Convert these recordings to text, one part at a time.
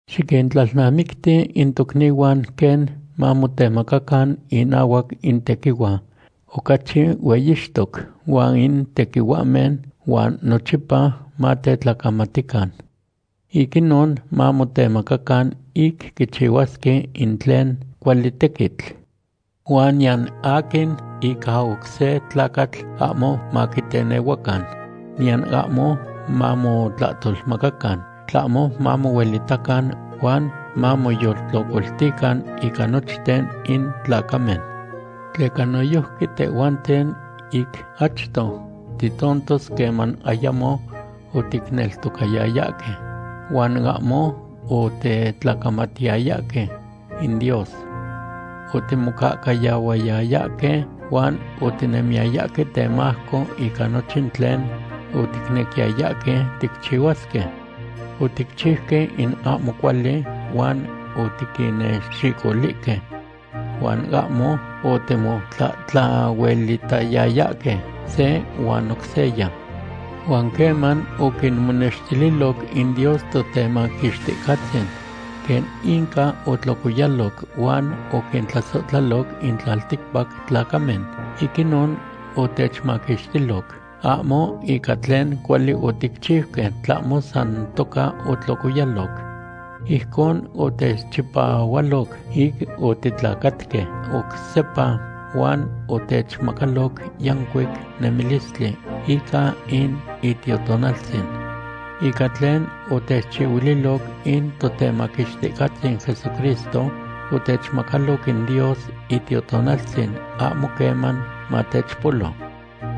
Xiquintlalnamicti in tochnihuan quen mamotemacacan inahuac in tequihua ocachi hueyixtoc huan in tequihuahmen, huan nochipa matetlacamatican. Ic inon mamotemacacan ic quichihuasque in tlen cuali tequitl. Huan niyan aquin ica oc se tlacatl ahmo maquitenehuacan, niyan ahmo mamotlahtolmacacan, tlahmo mamohuelitacan huan mamoyoltlocoltican ica nochten in tlacamen. Tleca noyojqui tehhuanten ic achto titontos queman ayamo oticneltocayayahque, huan ahmo otetlacamatiyayahque in Dios. Otimocahcayahuayayahque huan otinemiyayahque temajco ica nochin tlen oticnequiyayahque ticchihuasque. Oticchiuque in ahmo cuali huan otiquinnexicolihque. Huan ahmo otimotlatlahuelitayayahque se huan oc seya. Huan queman oquimonextililoc in Dios Totemaquixticatzin quen inca otlocoyaloc huan oquintlasohtlaloc in tlalticpac tlacamen, ic inon otechmaquixtiloc, ahmo ica tlen cuali oticchiuque, tlahmo san toca otlocoyaloc. Ijcon otechchipahualoc ic otitlacatque oc sepa huan otechmacaloc yancuic nemilistli ica in Itiotonaltzin. Ica tlen otechchihuililoc in Totemaquixticahtzin Jesucristo, otechmacaloc in Dios Itiotonaltzin ahmo queman matechpolo.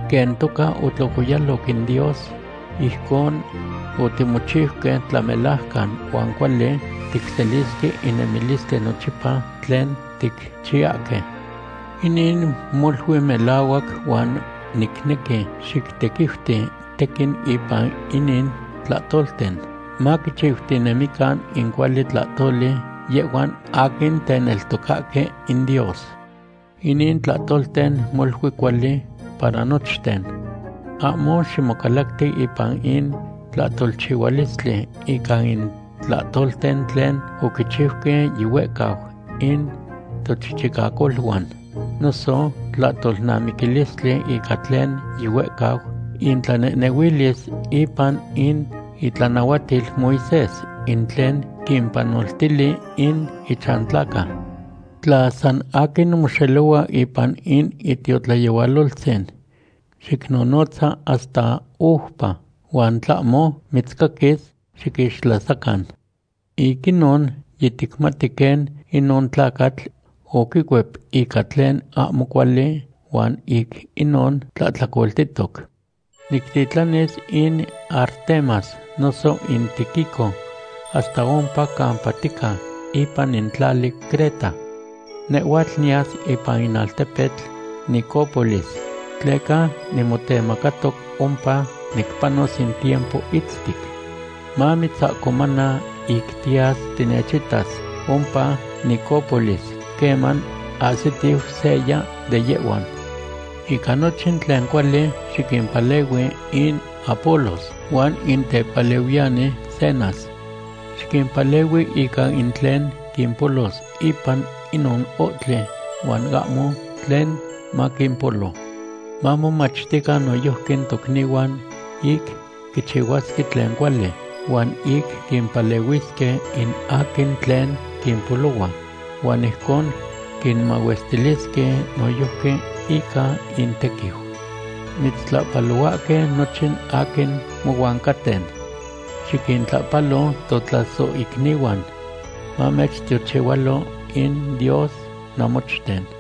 Quen toca otlocoyaloc in Dios, ijcon otimochiuque tlamelajcan huan cuali ticselisque in nemilistli nochipa tlen ticchiyahque. Inin molui melahuac huan nicnequi xictequiuti tequin ipan inin tlahtolten, maquichiutinemican in cuali tlahtoli yehhuan aquin teneltocahque in Dios. Inin tlahtolten molui cuali para nochten. Ahmo ximocalacti ipan in tlahtolchihualistli ica in tlahtolten tlen oquichiuque yihuehcau in tochichicacoluan, noso tlahtolnamiquilistli ica tlen yihuehcau tlanehnehuilis ipan in itlanahuatil Moisés, in tlen quimpanoltili in ichantlaca. Tla san aquin moxelohua ipan in itiotlayehualoltzin, xicnonotza hasta oupa, huan tlahmo mitzcaquis, xiquixtlasacan. Ic inon yiticmati quen inon tlacatl oquicuep ica tlen ahmo cuali huan ic inon tlahtlacoltihtoc. Nictitlanis in Artemas noso in Tíquico hasta ompa campa tica ipan in tlali Creta. Nehhuatl niyas ipan in altepetl Nicópolis tleca nimotemacatoc ompa nipanos in tiempo itztic. Mamitzahcomana ic tiyas tinechitas ompa Nicópolis queman ahsitiu seya de yehhuan. Ica nochin tlen cuali xiquimpalehui in Apolos huan in tepalehuiyani Zenas. Xiquimpalehui ica in tlen quimpolos ipan inon ohtli huan ahmo tlen maquimpolo. Mamomachtican noyojqui tocnihuan, ic quichihuasque tlen cuali, huan ic quimpalehuisque in aquin tlen quimpolohua, huan ijcon quinmahuestilisque noyojqui ica intequiu. Mitztlapalohuahque nochin aquin nohuan caten. Xiquintlahpalo totlasohicnihuan. Mamechtiochihualo in Dios namochten.